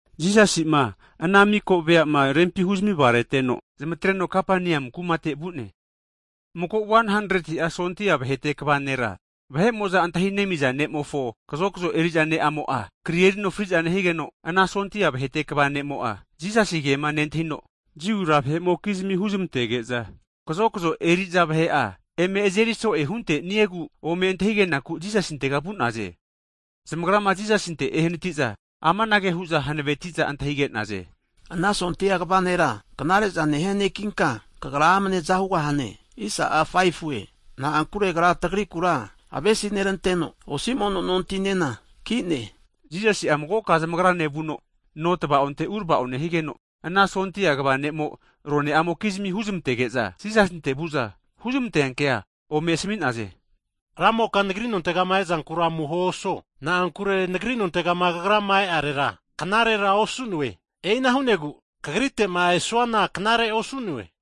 Jisasi'ma ana miko veama rempima huzami vagareteno zamatreno Kapaneamu kumate vu'ne. Mago 100'a sondia vahete kva nera, vahe'mo'za antahi nemiza ne'mofo, kazokzo eri'za ne'amo'a, kri erino fri'za nehigeno, ana sondia vahete kva ne'mo'a Jisasinkema nentahino, Jiu ranra vahe'mokizmi huzmantege'za kazokzo eri'za vahe'a eme azeri so'e hunteniegu ome antahigenaku Jisasintega vu'naze. Zamagrama Jisasinte enehanati'za amanage hu'za hanaveti'za antahige'naze. Ana sondia kva nera knare'za nehia nekinka, Kagra amne aza hugahane. Na'ankure agra tagrikura avesineranteno, osi mono nontinena ki'ne. Jisasi'a magoka zamagrane vuno, nontava'onte uravao nehigeno, ana sondia kva ne'mo'a rone'amokizimi huzmantege'za Jisasinte vu'za, huzmante'nea kea ome asami'naze. Ramoka nagri nontegama ezankura amuho osuo. Na'ankure nagri nontega kagrama e'arera knarera osu'noe. E'ina hu'nogu, Kagrite'ma esuana knare osu'noe.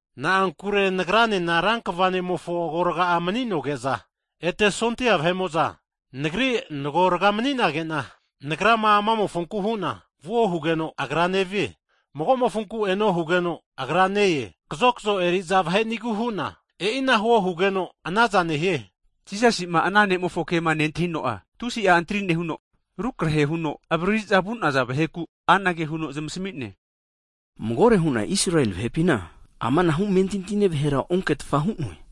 Na'ankure nagranena rankva ne'mofo agoraga'a mani'noge'za, ete sondia vahe'mo'za nagri nagorga mani'nage'na, nagrama anamofonku hu'na, vuo hugeno'a agra nevie. Hagi magomofonku eno hugeno'a, agra ne-e. Kazokzo eri'za vahenigu hu'na, e'ina huo hugeno anaza nehie. Higeno Jisasi'ma ana ne'mofo kema nentahino'a tusi'a antri nehuno, rukrahe huno avariri'za vu'naza vahekura anage huno zamasami'ne. Magore hu'na Israeli vahepina amanahu amentintine vahera onketfa hu'noe.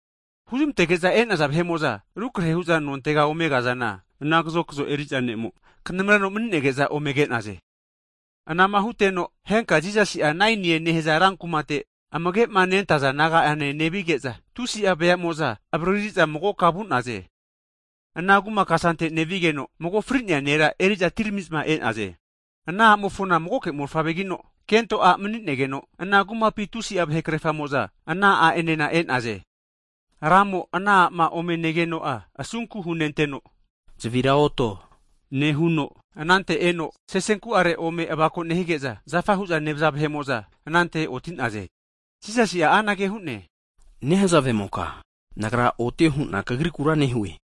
Huzmantege'za e'naza vahe'mo'za rukrahe hu'za nontega ome kazana, ana kazokzo eri'za ne'mo knamreno mani'nege'za ome ke'naze. Anama huteno henka Jisasi'a Nainie nehaza rankumate amage'ma nentaza disaipol naga'ane nevige'za, tusi'a veamo'za avariri'za magoka vu'naze. Ana kuma kasante nevigeno, mago fri'nea nera eri'za atirami'zma e'naze. Ana a'mofona magoke mofavregino, kento'a mani'negeno ana kumapi tusi'a vahe krefamo'za ana a'enena e'naze. Ramo ana a'ma ome negeno'a asunku hunenteno, Zavira oto nehuno, anante eno sesenku'are ome avako nehigeza, zafa hu'za nevaza vahe'mo'za anante oti'naze. Jisasi'a anage hu'ne, Nehazavemoka Nagra otio hu'na kagrikura nehue!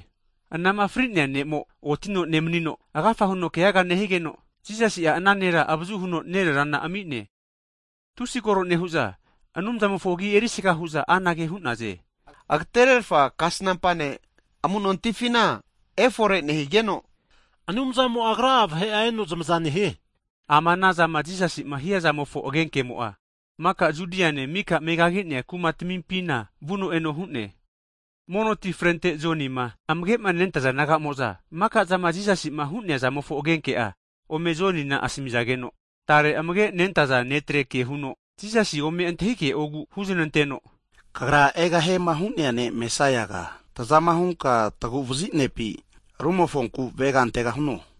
Anama fri'nea ne'mo'a otino nemanino, agafa huno keaga nehigeno, Jisasi'a ana nera avazuhuno nererana ami'ne. Tusi koro nehu'za Anumzamofo agi erisaga hu'za anage hu'naze. Agatererfa kasnampa ne' amu'nontifina efore nehigeno, Anumzamo'a Agra'a vahe'a eno zamaza nehie hu'naze! Ama anazama Jisasi'ma hiazamofo agenkemo'a maka Judiane mika megagi'nea kumatamimpina vuno eno hu'ne. Mono ti frente Jonima amage'ma nentaza disaipol naga'mo'za maka'zama Jisasi'ma hu'neazamofo agenke'a ome Jonina asamizageno, tare amage'manenta'a disaipol ne'tre kehuno, Jisasi ome antahige'ogu huznanteno, Kagra egahiema hu'nea ne Mesaiaga tazama hunka taguvazi ne'pi, rumofonku avega antegahuno?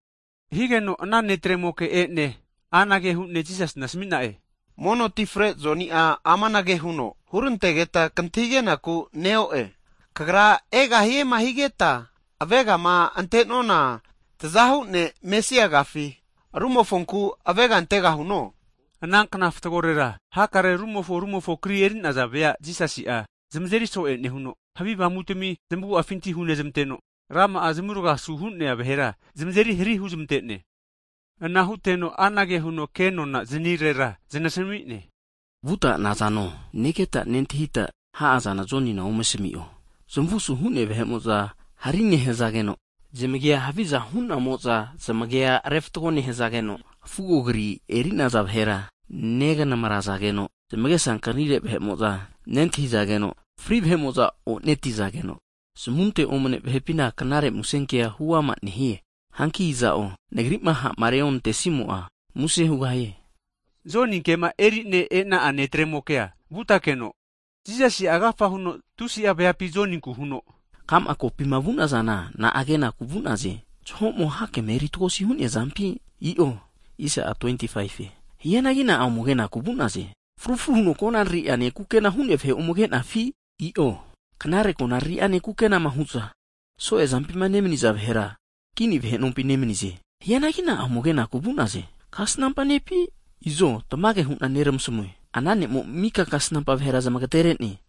Higeno ana netremoke e'ne anage hu'ne Jisasina asami'na'e, Mono ti fre Joni'a amanage huno hurantegeta kantahigenaku neo'e. Kagra egahiema higeta avegama ante'nona tazahu ne' Mesaiagafi, rumofonku avega antegahuno? Anankna fatgorera hakare rumofo rumofo kri eri'naza vea Jisasi'a zamazeri so'e nehuno, havi avamutmi zmagu'afinti hunezmanteno, rama'a zmurga asu hu'nea vahera zamazeri hari huzmante'ne. Ana huteno anage huno kenona zanirera, zanasami'ne, Vuta nazano negeta nentahita ha'azana Jonina ome asami'o, zamavu asu hu'nea vahe'mo'za hari nehazageno, zamagia haviza hu'namo'za zamagia refatgo nehazageno, fugonkrima eri'naza vahera neganamrazageno, zamagesa ankanire vahe'mo'za nentahizageno, fri vahe'mo'za onetizageno, zamunte omane vahe'pina Knare Musenkea huama nehie. Hanki iza'o Nagri'ma ha'ma reonantesimo'a muse hugahie. Joninkema eri'ne e'na'a netremokea vutakeno, Jisasi'a agafa huno tusi'a veapi Joninku huno, Ka'ma kopima vu'nazana na'a kenaku vu'naze? Jaho'mo hakema eri tagosi hu'nea zampi? I'o. Hianagi Na'a ome kenaku vu'naze? Fru fru huno konariri'ane kukena hu'nea vahe ome kenafi? I'o, knare konariri'ane kukenama hu'za, so'e zampima nemaniza vahera, kini vahe nompi nemanize! Hianagi na'a ome kenaku vu'naze? Kasnampa nepi? Izo tamage hu'na neramasmue. Ana ne'mo mika kasnampa vahera zmagatere'ne.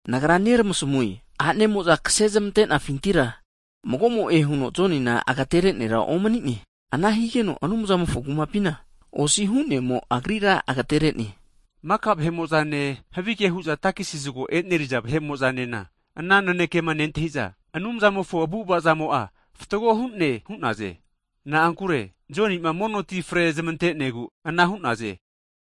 Nagra neramasamue, a'nemo'za kase zamante'naza vahepintira mago'mo'e huno Jonima agatere'nea nera omani'ne, ana nehigeno Anumzamofo Kumapina osi hu'nemo, agrira agetere'ne. Maka vahe'mo'zane havige hu'za takesi zago eneriza vahe'mo'zanena ana nanekema nentahiza, Anumzamofo avu'avazamo'a fatgo hu'ne hu'naze. Na'ankure Joni'ma mono tifre zmantenegu ana hu'naze.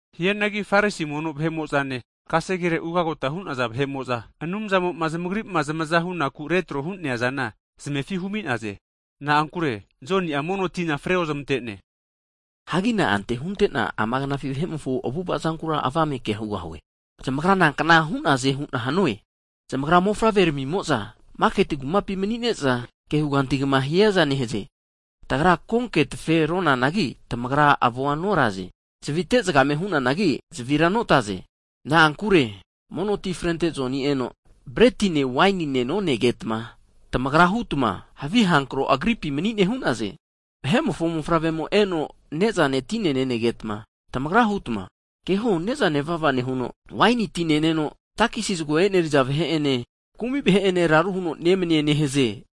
Hianagi Farisi mono vahe'mo'zane, kasegere ugagota hu'naza vahe'mo'za, Anumzamo'ma zamagri'ma zamaza hunaku retro hu'neazana zmefi humi'naze. Na'ankure zamagrira Joni'a mono tina fre ozmante'ne. Hagi na'ante huntena ama knafi vahe'mofo avu'avazankura avame kea hugahue. Zamagra nankna hu'naze hu'na hanue? Zamagra mofavre'ramimo'za maketi kumapi mani'ne'za kehugantigama hiaza nehaze. Nehu'za roane'amokizmigura anage hu'naze, Tagra konke tafe ronanagi, tamagra avoa noraze. Zavite zagame hunanagi, zavira notaze. Na'ankure mono tifrente Joni eno, bretine waini tine nonegetma, tamagra hutma havi avamu agripi mani'ne hu'naze. Vahe'mofo Mofavremo eno ne'zane tine nenegetma, tamagra hutma, keho ne'za nevava nehuno, waini ti neneno, takesi zago eneriza vahe ene kumi vahe'ene raru huno nemanie nehaze!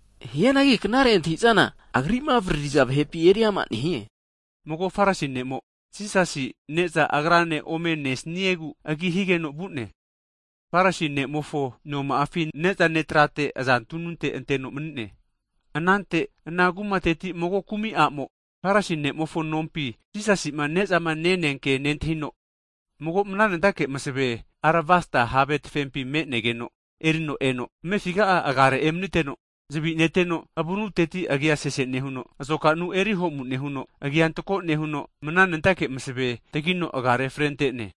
Hianagi knare antahintahizana Agri'ma avaririza vahepi eriama nehie. Mago Farisi ne'mo'a, Jisasina ne'za agrane ome nesniegu agi higeno vu'ne. Farisi ne'mofo noma'afi ne'zane trate aza tununte anteno mani'ne. Anante ana kumateti mago kumi a'mo'a, Farisi ne'mofo nompi Jisasima nezama nene nehazankema nentahino, mago mananentake masave aravasta have tafempi me'negeno erino eno, amefiga'a agare emaniteno, zavi neteno avunuteti agia sese nehuno, azokanu eri ho'mu nehuno, rama'a zupa agia antako nehuno, mana nentake masave tagino agare frente'ne.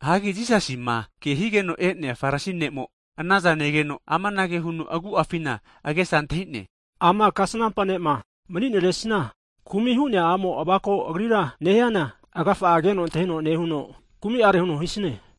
Hagi Jisasima ke higeno e'nea Farisi ne'mo'a anazana negeno, amanage huno agu'afina agesa antahi'ne, ama kasnampa ne'ma mani'neresina, kumi' hu'nea a'mo avako Agrira nehiankino, agafa'a keno antahino nehuno kumi are huno hisine.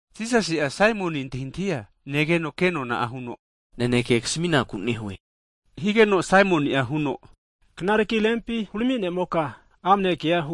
Jisasi'a Saimoni antahintahia negeno kenona'a huno, Saimoniga, naneke kasminaku nehue higeno, Saimoni'a huno, knareki Rempi hurami ne'moka amne kea huo.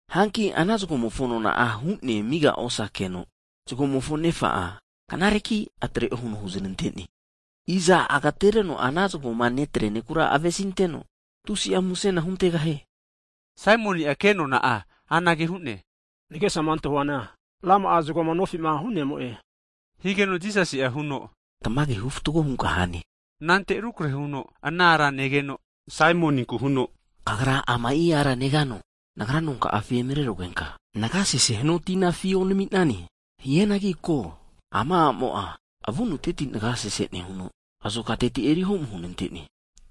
Hanki ana zagomofo nona'a hu'ne amiga osakeno, knareki atre'o, huno huzanante'ne. Iza agtereno ana zagoma nofitema netrea nekura avesinenteno tusi musena huntegahie? Saimoni'a kenona anage hu'ne, nagesama antahuana rama'a zagoma nofi'ma hu'nemo'e. Higeno Jisasi'a huno, Tamage hufatgo hunka hane. Anante rukrehe huno ana ara negeno, Saimoninku huno, Kagra ama'i ara negano? Nagra nonka'afi emarerugenka nagia sese hanua tina afi onami'nane. Hianagi ko, ama a'mo'a avunuteti nagia sese nehuno, azokateti erihomu hunante'ne.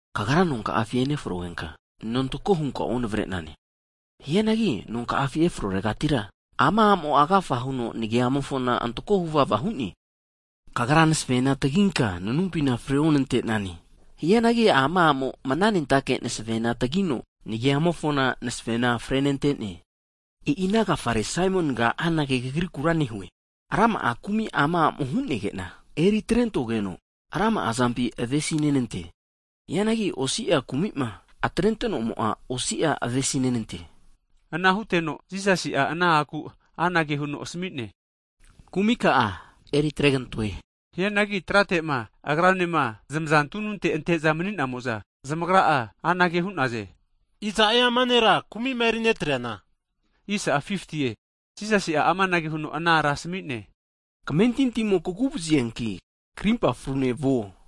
Kagra nonka'afi enefrogenka nantako hunka onavre'nane. Hianagi nonka'afi efroregatira ama amo'a agafa huno nagiamofona antako huvava hu'ne. Kagra masavena taginka nanumpina freonante'nane. Hianagi ama a'mo mananentake masevena tagino nagiamofona masavena frenante'ne. E'ina agafare Saimoniga anage kagriku nehue, rama'a kumi ama amo hu'nege'na eri atrentogeno rama'azampi avesinenante. Hianagi osi'a kumi'ma atrente'nomo'a osi'a avesinenante. Ana huteno Jisasi'a ana a'ku anage huno asami'ne, Kumika'a eritregantoe. Hianagi trate'ma agrane zamaza tununte ante'za mani'namo'za, zamagra'a anage hu'naze. Iza'e ama nera, kumi'ma erinetreana? Jisasi'a amanage huno ana ara asami'ne, Kamentintimo kaguvazianki, krimpa frune vuo.